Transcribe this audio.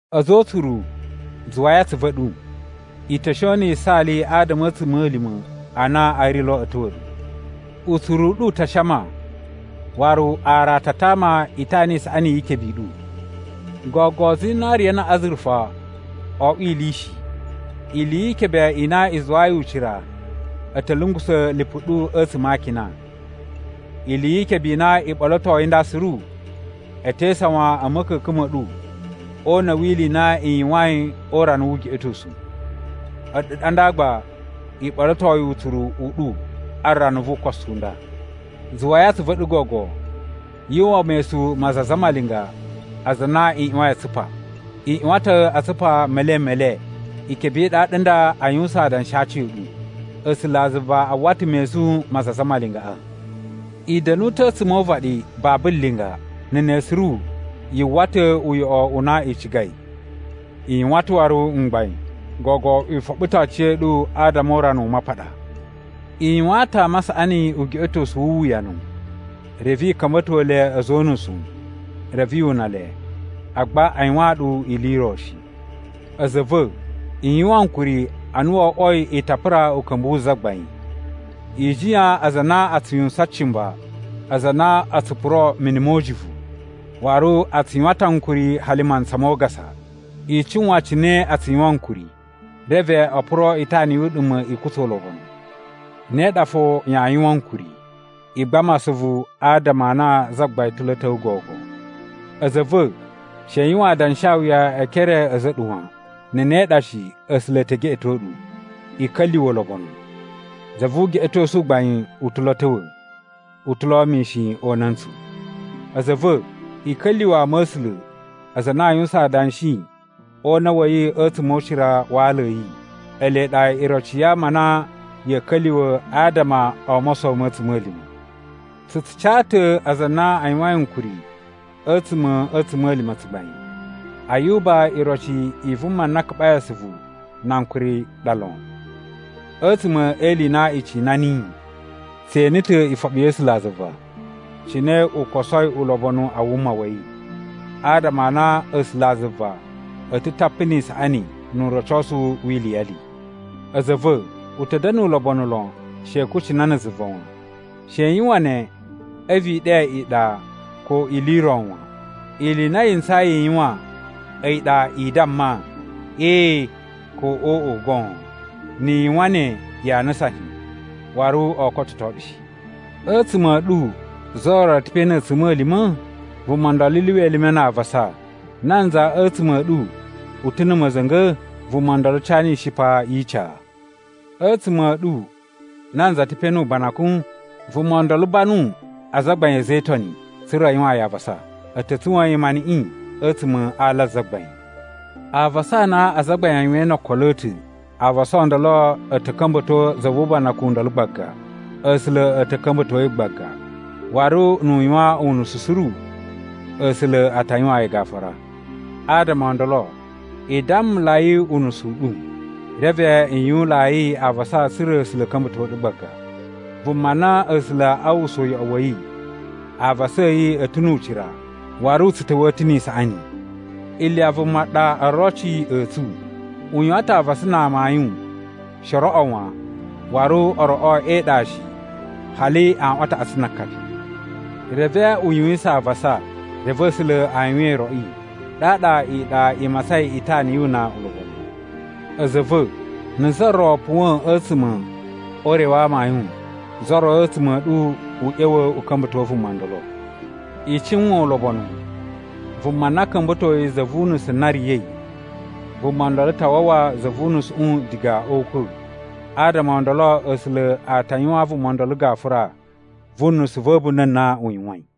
A̱za̱ o utsuru, zuwai atsuvu a̱ ɗu. I ta̱ shon na̱ yisaali adama a̱ a̱tsuma̱lima̱ a na a̱ ri lo a̱ ta̱wa̱ ɗu. Utsuru u ɗu u ta shama, waru aran a ta tama itana i saꞌani yi ikebe i ɗu. Gogo zinariya na̱ azurufa oo oꞌwo ili shi. Ili yi ikebe i na i zuwayi ucira, a̱ ta̱ lungusa̱ lipu ɗu a̱tsuma̱ a akina. Ili yi ikebe i na i ɓolotoi nda suru, e te isawan a̱ ma̱ka̱ka̱n ma̱ ɗu o una̱ wi ili i na i yuwain o urana wu ugeꞌetosu. A̱ɗu ɗa nda gba i ɓolotoi utsuru u ɗu a rana vu ukosu u nda. Zuwai atsuvu a̱ ɗu gogo! Yu uwwa mesun ma aza a zamalinga aza a na i ꞌyuwain a tsupa. I ꞌyuwan ta̱ a tsupa melen me le, ikebe i ɗaɗa n nda a yuwusan adanshi a aci a̱ ɗu. A̱sulazuva a uwwa ta̱ mesun ma aza a zamalingaꞌa. I da̱nu ta̱ a̱tsuma̱ o uvaɗi babu linga, na̱ ne suru yu uwwa ta̱ uyoꞌo u na i cigai. I yuwan ta̱ waru mgbain gogo i foɓo ta̱ aciya̱ɗu adama o urana u mapaɗa. I yuwaan ta̱ ama a saꞌani ugeꞌetosu wu uwuyanu, reve i ka̱mba̱to le a̱za̱ o unusu, reve yu una le, agba a yuwaan ɗu ili i ro shi. A̱za̱ a̱ va̱, i yuwan ankuri ana wo oꞌwoi i ta pura uka̱mbu wu Zagbain. I jiyan aza a na a tsu yuwusan cimba, aza a na o tsu puro mini mo ujuvu, waru a tsu yuwan ta̱ ankuri hali mantsa mo ugasa. I cuwan cine a tsu yuwan ankuri, reve o puro itana yu uɗuma̱ i kutsa ulobonu. Ne ɗa fo yaa yuwaan ankuri. I gbama asuvu adama a na Zagbain ta̱ lo a̱ ta̱wa̱ gogo. A̱za̱ a̱ va̱, she i yuwan adanshawuya e ekere a̱za̱ a̱ ɗu wan. Na̱ ne ɗa shi A̱sula̱ e te geꞌeto ɗu. I ka̱lyuwa̱ ulobonu! Za vu ugeꞌetosu u gbain u ta̱ lo a̱ ta̱wa̱. U ta̱ lo mishin o una̱ntsu! A̱za̱ a̱ va̱, i ka̱lyuwa̱ ama a̱ A̱sula̱ aza a na a yuwusan adanshi o una̱ wa̱ yi a̱tsuma̱ o ucira wa ala a̱ yi. Ele ɗa iroci ya ama a na ya̱a̱ ka̱lyuwa̱ adama o mosowo ma̱ a̱tsuma̱lima̱. Tsu tsu ca ta̱ aza a na a yuwain ankuri a̱tsuma̱ a̱ a̱tsuma̱lima̱ tsugbain. Ayuba iroci i vuma na kaɓai asuvu na ankuri ɗa lon. A̱tsuma̱ e ili i na i cina niyi, tse ene ta̱ ifoɓi ya̱ A̱sulazuva cine u kosoi ulobonu a wuma wa̱ yi, adama a na A̱sulazuva a̱ ta̱ tapu ni isaꞌani nu urocosu wi iliyali. A̱za̱ a̱ va̱, u ta̱ da̱na̱ ulobonu lon she i kucina na̱ zuva wan. She i yuwan ne a̱vu i ɗe iɗa ko ili i ro wan. Ili i na yi ntsayi i yuwan a̱yi ɗa i damma “ee” ko “oꞌo” goon. Ni i yuwan ne yaa nusan shi, waru oo kototo ɗu shi. A̱tsuma̱ a̱ ɗu za ro ta̱ pe na̱ a̱tsuma̱lima̱? Vuma ndolo lyuwa elime na avasa. Nanza a̱tsuma̱ a̱ ɗu u ta̱ na̱ ma̱za̱nga̱? Vuma ndolo cana ishipa yi ica. A̱tsuma̱ a̱ ɗu nanza ta̱ pe nu ubanakun? Vuma ndolo banu azagbain a̱ a̱za̱ e Itoni tsa̱ra̱ a yuwaan yi avasa. A̱ ta̱ tsuwa̱a̱n yi maniꞌin a̱tsuma̱ a ala a Zagbain. Avasa a na azagbain a yuwain no okolo a̱ ta̱, avasa o ndolo a̱ ta̱ ka̱mba̱to za vu ubanakun u ndolo gbaga. A̱sula̱ a̱ ta̱ ka̱mba̱to yi gbaga. Waru nu u yuwan unusu suru, A̱sula̱ a ta yuwaan yi gafura. Adama o ndolo, i dammulai unusu u ɗu, reve i yuwunlayi avasa tsa̱ra̱ A̱sula̱ a̱ ka̱mba̱to ɗu gbaga. Vuma na A̱sula̱ a uwwusa uyoꞌo wa̱ yi, avasa a̱ yi a̱ ta̱ nu ucira waru u tsu ta̱wa̱a̱ ta̱ ni isaꞌani. Iliya vuma ɗa oroci a̱ tsu. U yuwan ta̱ avasa na amayun she o roꞌo wan, waru o roꞌo e iɗa shi, hali aꞌwan a taꞌatsu na akapi. Reve u yuwisan avasa, reve A̱sula̱ a yuwan iroꞌi, ɗaɗa iɗa i matsain itana yu una ulobonu. A̱za̱ a̱ va̱, na̱ za ro puwa̱a̱n a̱tsuma̱ o ure wa amayun, za ro a̱tsuma̱ a̱ ɗu u ꞌya̱wa̱ u ka̱mba̱to vuma ndolo. I cuwan ulobonu, vuma na ka̱mba̱toi za vu unusu na riya̱i, vuma ndolo ta wawa za vu unusuꞌu diga o ukwa̱, adama o ndolo A̱sula̱ a ta yuwaan vuma ndolo gafura vu nusu va̱ a̱bunda̱ na u yuwain.